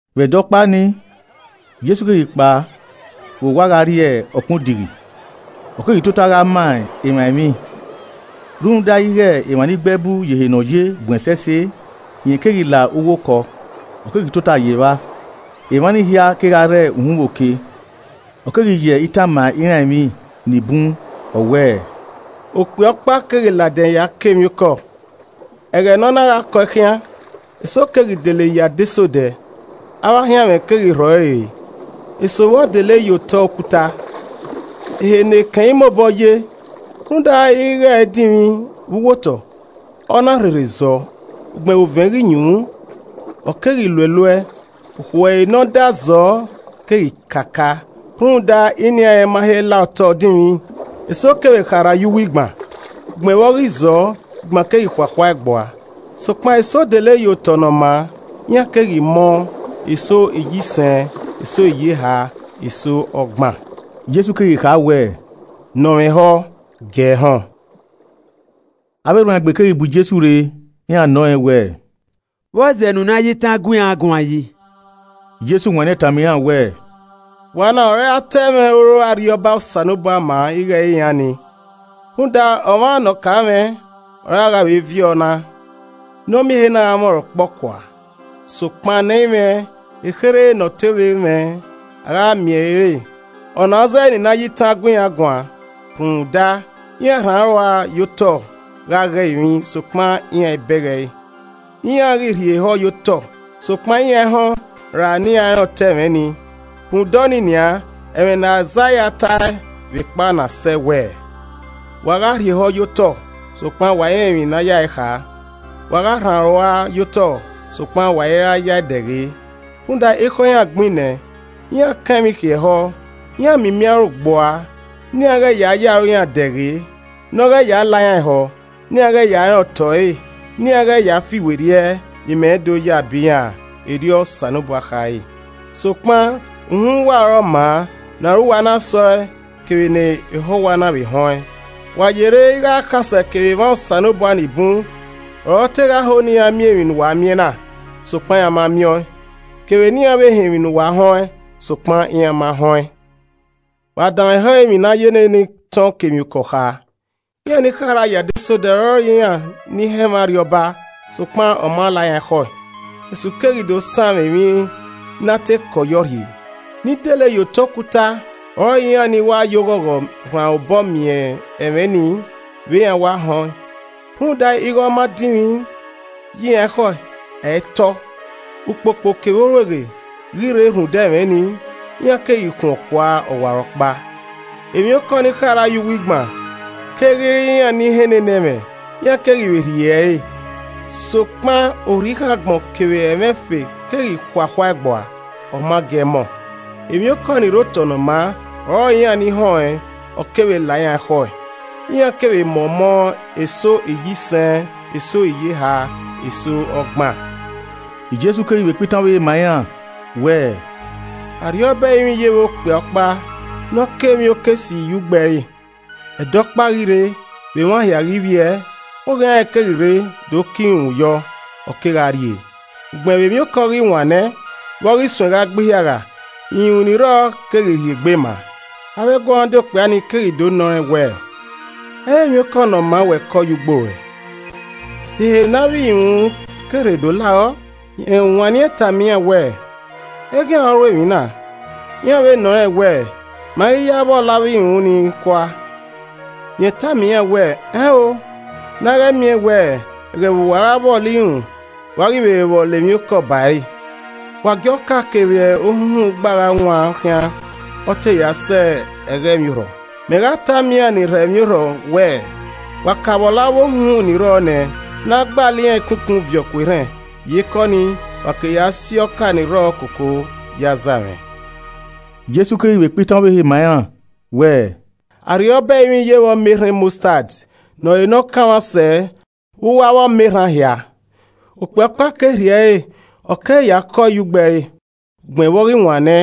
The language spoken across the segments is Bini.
Vbe ẹdẹ ọkpa ni, Jesu keghi kpao vbe owa gha rrie ọkpẹn odighi, ọ keghi tota gha ma emwa emwi. Rhunmwuda ighe emwa ni gbe ẹbu ye ehe ne ọ ye bun ẹsẹse, rẹn keghi la uwu okọ, ọ keghi tota ye evba, emwa ni hia kegha rre uhunmwu oke. Ọ keghi ya itan ma iran emwi nibun. Ọ wẹẹ, “Okpia ọkpa keghi ladian ya kọ emwiokọ. Ẹghẹ ne ọ na gha kọe khian, eso keghi dele ye adesẹ odẹ, avbe ahianmwẹ keghi rhọ ẹre re. Eso vbọ dele ye otọ okuta, ehe ne ekẹn i mobọ ye. Rhunmwuda ighẹ ẹ i dinmwi vbe uwu otọ, ọ na rherhe zọọ. Ugbẹn vbe ovẹn ghi yunmwu, ọ keghi luẹluẹ, ukhu ẹre ne ọ da zọọ keghi kakaa rhunmwuda inian rẹn ma he la otọ dinmwi. Eso kevbe kharha ye uwu igban. Ugbẹn vbe ọ ghi zọọ, igban keghi khuakhua gbua. Sokpan eso dele ye otọ ne ọ maa, iran keghi mọ, eso iyisẹn eso iyeha, eso ọgban.” Jesu keghi kha wẹ, “Ne ọ mwẹ ehọ, giee họn.” Avbe erhuanegbe keghi bu Jesu rre, iran nọ rẹn wẹẹ, “Vbọzẹ ne u na ye itan gu iran guan yi?” Jesu wanniẹn tama iran wẹẹ, “Wa na ọre a ta ẹmwẹ oro Arriọba Osanobua ma ighẹ ẹ i re iran ni. Rhunmwuda ọmwa ne ọ ka mwẹ, ọre a gha ye vbe viọ na, ne ọ miẹn ehe na gha mwẹ ọnrẹn ọkpọkua. Sokpan ne ẹ i mwẹ, ekherhe ne ọ te vbe mwẹ, a gha wa miẹn ẹre re. Ọna ọ zẹẹ ne I na ya itan gu iran guan. Rhunmwuda, iran rhan aro rua ye otọ gha ghe emwi, sokpan iran i bẹghe ẹre. Iran ghi rhie ehọ ye otọ, sokpan iran i họn ra ne iran rẹn otọ ẹmwẹ nii. Rhunmwuda ọnii nian, ẹmwẹ ne Aizaia tae vbekpa ọna sẹe wẹẹ, “ ‘Wa gha rhie ehọ ye otọ, sokpan wa i rẹn emwi ne a yae kha. Wa gha rhan aro rua ye otọ, sokpan wa i ra ya e dẹghe. Rhunmwuda ekhọe iran gbin nẹ, iran kan emwi khiẹ ehọ, iran mimi aro gbua. Ne iran ghẹ ya ye aro iran dẹghe, ne ọ ghẹ ya la iran ehọ, ne iran ghẹ ya rẹn otọ ẹre ne iran ghẹ ya fiwerriẹ ne imẹ do ya bọ iran erriọ Osanobua khare.’ “Sokpan, uhunmwu uwa ọre ọ maa ne aro uwa na sẹ ọe kevbe ne ehọ uwa na vbe họn ẹn. Wa yerre ighẹ akhasẹ kevbe emwa Osanobua nibun ọre ọ te gha ho ne iran miẹn emwi ne uwa miẹn na, sokpan iran ma miẹn ọẹn, kevbe ne iran vbe họn emwi ne uwa họn ẹn, sokpan iran ma họn ẹn. “Wa danmwehọ emwi ne a ya ne ne itan ọkemwiokọ kha. Iran ni kharha ye adesẹ odẹ ọrọre iran ni họn ẹmwẹ Arriọba, sokpan ọ ma la iran ekhọe. Esu keghi do sanmwẹ emwi ne a te kọ yọ rhie. Ni dele ye otọ okuta ọrọre iran ni wa ye oghogho rhan obọ miẹn ẹmwẹ ni vbe iran wa họn ẹn. Rhunmwuda ighẹ ọ ma dinmwi ye iran ekhọe, ẹ i tọ. Ukpokpo kevbe orueghe ghi rre rhunmwuda ẹmwẹ ni, iran keghi khuọn kua ọwarọkpa. Emwiokọ ni kharha ye uwu igban keghi re iran ni họn ne ne ẹmwẹ, iran keghi vbe rhie ẹre. Sokpan orhikhan agbọn kevbe ẹmwẹ ẹfe keghi khuakhua ẹe gbua, ọ ma gie ẹe mọ. Emwiokọ ni rre otọ ne ọ maa ọrọre iran ni họn ẹn, ọ keghi vbe la iran ekhọe, iran kevbe mọ ọmọ eso iyisẹn, eso iyeha, eso ọgban.” Jesu keghi vbe kpa itan ọvbehe ma iran wẹẹ, “Arriọba ẹrinmwi yevbe ọkpia ọkpa ne ọ kọ emwiokọ esi ye ugbo ẹre. Ẹdẹ ikẹtin ghi rre, vbe emwa hia ghi vbiẹ, oghian rẹn keghi rre do kọ irunmwu yọ, ọ kegha rrie. Ugbẹn vbe emwiokọ ghi wan nẹ, vbe ọ ghi suẹn gha gbe ihiagha, irunmwu ni rrọọ keghi rhiegbe ma. Avbe eguọmwadia okpia ni keghi do nọ rẹn wẹẹ, ‘Ẹ i re emwiokọ ne ọ maa wẹ kọ ye ugbo ruẹ, de ehe ne avbe irunmwu ke rre do la rọ?’ Rẹn wanniẹn tama iran wẹẹ, ‘Eghian ọre ọ ru emwi na.’ Iran vbe nọ Rẹn wẹẹ, ‘Ma ghi ya vbọlọ avbe irunmwu ni kua?’ Rẹn tama iran wẹẹ, ‘Ẹn o, na ghẹ miẹn wẹ, ẹghẹ vbe uwa a gha vbọlọ irunmwu, wa ghi vbe vbọlọ emwiokọ ba ẹre. Wa gie ọka kevbe ohunhun gba gha wan khian ọ te ya sẹ ẹghẹ emwiorhọ. Mẹ gha tama iran ni rhọ emwiorhọ wẹẹ, wa ka vbọlọ avbe ohunhun ni rrọọ nẹ, ne a gbalọ iran ikun ikun viọ ku erhẹn, iyeke ọnii, wa ke ya si ọka ni rrọọ koko ya aza mwẹ.’” Jesu keghi vbe kpa itan ọvbehe ma iran wẹẹ, “Arriọba ẹrinmwi yevbe ọmọ erhan mọstad ne ọ re ne ọ kanmwa sẹ vbe uwu avbe ọmọ erhan hia. Ọkpia ọkpa ke rhie ẹre ọ keghi ya kọe ye ugbo ẹre. Ugbẹn vbe ọ ghi wan nẹ,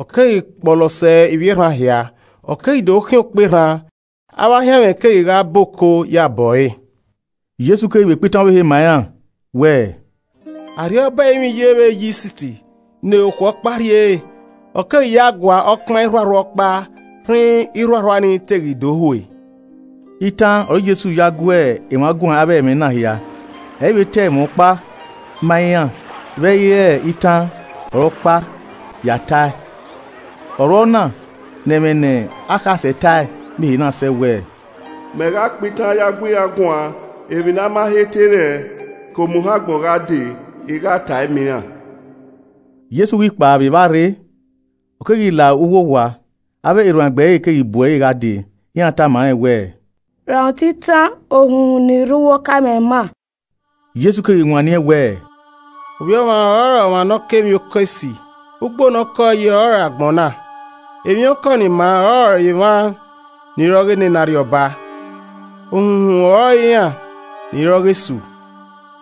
ọ keghi kpọlọ sẹ ivbi erhan hia. Ọ keghi do khian okperhan, avbe ahianmwẹ keghi gha bọ oko ye abọ ẹre.” Jesu keghi vbe kpa itan ọvbehe ma iran wẹẹ, “Arriọba ẹrinmwi yevbe eyist ne okhuo ọkpa rhiere, ọ keghi yae gua ọkpan irhuarhua ọkpa rhinrin irhuarhua ni te ghi do hue.” Itan ọre Jesu ya gu emwa guan avbe ẹmwẹ na hia, ẹ i vbe ta ẹmwẹ ọkpa ma iran vbe ẹ i re itan ọre ọ kpa ya tae. Ọ ru ọna ne ẹmwẹ ne akhasẹ tae miẹn ehe na sẹ wẹẹ, “Mẹ gha kpa itan ya gu iran guan, emwi ne a ma he te rẹn, ke omuhẹn agbọn gha dee, i gha tae ma iran.” Jesu ghi kpao vbe evba rre, ọ keghi la uwu owa. Avbe erhuanegbe ẹre keghi bu ẹre gha dee, iran tama rẹn wẹẹ, “Rhan otọ itan ohunhun ni rre uwu ọka ma ima.” Jesu keghi wanniẹn wẹẹ, “Ovbi Ọmwa ọrọre ọmwa ne ọ kọ emwiokọ esi. Ugbo ne ọ kọ ẹe yi ọrọre agbọn na, emwiokọ ni maa ọrọre emwa ni re ọghe nene Arriọba, ohunhun ọrọre iran ni re ọghe Esu.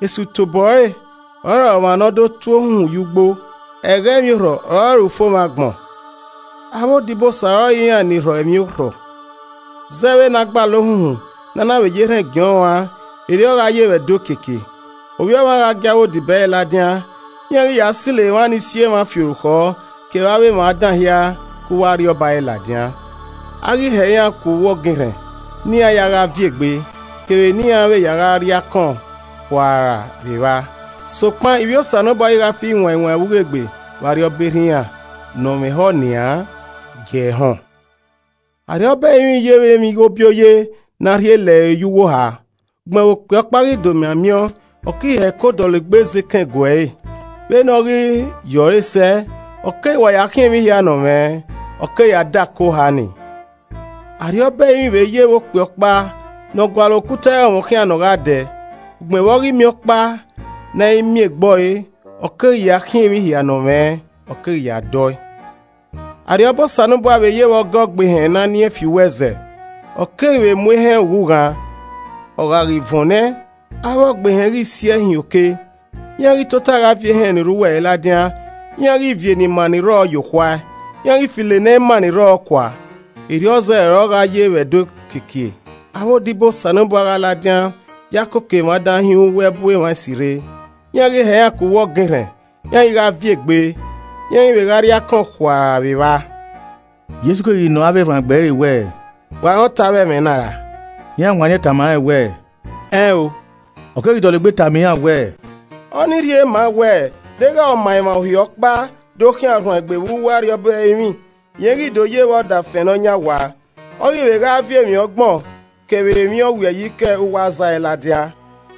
Esu tobọ ẹre ọrọre ọmwa ne ọ do tu ohunhun ye ugbo. Ẹghẹ emwiorhọ ọrọre ufomwẹ agbọn. Avbe odibosa ọrọre iran ni rhọ emwiorhọ. Zẹ vbene a gbalọ ohunhun, ne a na vbe ya erhẹn giẹn ọnrẹn uan, erriọ gha ye vbe ẹdẹ okiekie. Ovbi Ọmwa gha gie avbe odibo ẹre ladian, iran ghi ya silo emwa ni si emwa fi orukhọ, kevbe avbe emwa dan hia ke uwu Arriọba ẹre ladian. A ghi hẹ iran ku uwu ọgẹn erhẹn ne iran ya gha viẹ egbe, kevbe ne iran vbe ya gha rri akọn khuara vbe evba. Sokpan ivbi Osanobua ghi gha fi wain wain vbe ughegbe vbe Arriọba Erha iran. Ne ọ mwẹ ehọ nian, gie ẹe họn. “Arriọba ẹrinmwi yevbe emwighobioye ne a rhie lẹre ye uwu oha. Ugbẹn vbe okpia ọkpa ghi domian miẹn ọẹn, ọ keghi hẹko dọlegbe zẹ ekẹn gue ẹre. Vbene ọ ghi ye ọre sẹ, ọ keghi wa ya khiẹn emwi hia ne ọ mwẹ, ọ ke ya dẹ ako oha ni. “Arriọba ẹrinmwi vbe yevbe okpia ọkpa nọ gualọ okuta ẹrọnmwọ khian ne ọ gha dẹ. Ugbẹn vbe ọ ghi miẹn ọkpa ne a i miẹn egbọre, ọ keghi ya khiẹn emwi hia ne ọ mwẹ, ọ keghi ya dẹ ọe. “Arriọba Osanobua vbe yevbe ọga ọgbehẹn ne a nien fi uwu ẹzẹ, ọ keghi vbe mu ehẹn ughughan. Ọ gha ghi vuọn nẹ, avbe ọgbehẹn ghi si ẹe hin oke. Iran ghi tota gha viọ ehẹn ni rre uwu ẹre ladian, iran ghi viọ ni maa ni rrọọ ye okhuae, iran ghi filo ne ẹ i maa ni rrọọ kua. Erriọ zẹ ọre ọ gha ye vbe ẹdẹ okiekie, avbe odibo Osanobua gha ladian ya koko emwa dan hin uwu ẹbu emwa esi rre. Iran ghi hẹ iran ku uwu ọgẹn erhẹn. Iran ghi gha viẹ egbe, iran ghi vbe gha rri akọn khuara vbe evba.” Jesu keghi nọ avbe erhuanegbe ẹre wẹẹ, “Wa rẹn otọ avbe ẹmwẹ na ra?” Iran wanniẹn tama rẹn wẹẹ, “Ẹn o.” Ọ keghi dọlegbe tama iran wẹẹ, “Ọnii rhie ma wẹ deghẹ ọma emwa Uhi ọkpa do khian ọrhuanegbe vbe uwu Arriọba ẹrinmwi, rẹn ghi do yevbe ọdafẹn nọyan owa, ọ ghi vbe gha viọ emwi ọgbọn kevbe emwi ọwiẹyi ke uwu aza ẹre ladian.”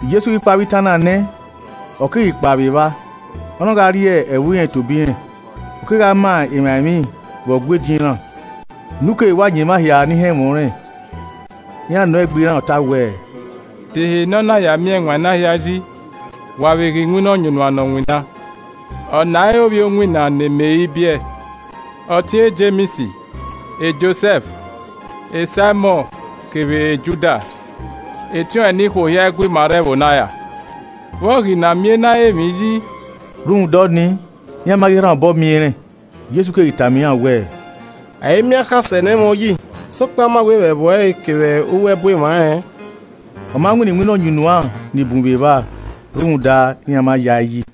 Jesu ghi kpa avbe itan na nẹ, ọ keghi kpa vbe evba, ọ na gha rrie ẹvbo irẹn tobọ irẹn, ọ kegha ma emwa emwi vbe Ọgua ediọn iran. unu keghi wa yan emwa hia ni họn ẹmwẹ ọnrẹn. Iran nọ egbe iran ọta wẹẹ, “De ehe ne ọ na ya miẹn ẹwaẹn na hia yi? Wa vbe ghe iwinna ọyunnuan ne ọ winna. Ọna i re ovbi owinna, ne Meri biẹe, ọtiẹn Jems, Josẹf Saimọn kevbe Judas. Etiọnrẹn nikhuo hia i gu ima rre ẹvbo na ra? Vbe ọ ghi na miẹn ena ghe emwi yi?” Rhunmwuda ọnii, iran ma ghi rhan obọ miẹn rẹn, Jesu keghi tama iran wẹẹ, “A i miẹn akhasẹ ne ẹ i mwẹ uyi, sokpan a ma wẹ vbe ẹvbo ẹre kevbe uwu ẹbu emwa rẹn.” Ọ ma winna iwinna ọyunnuan ni bun vbe evba rhunmwuda iran ma ya ẹe yi.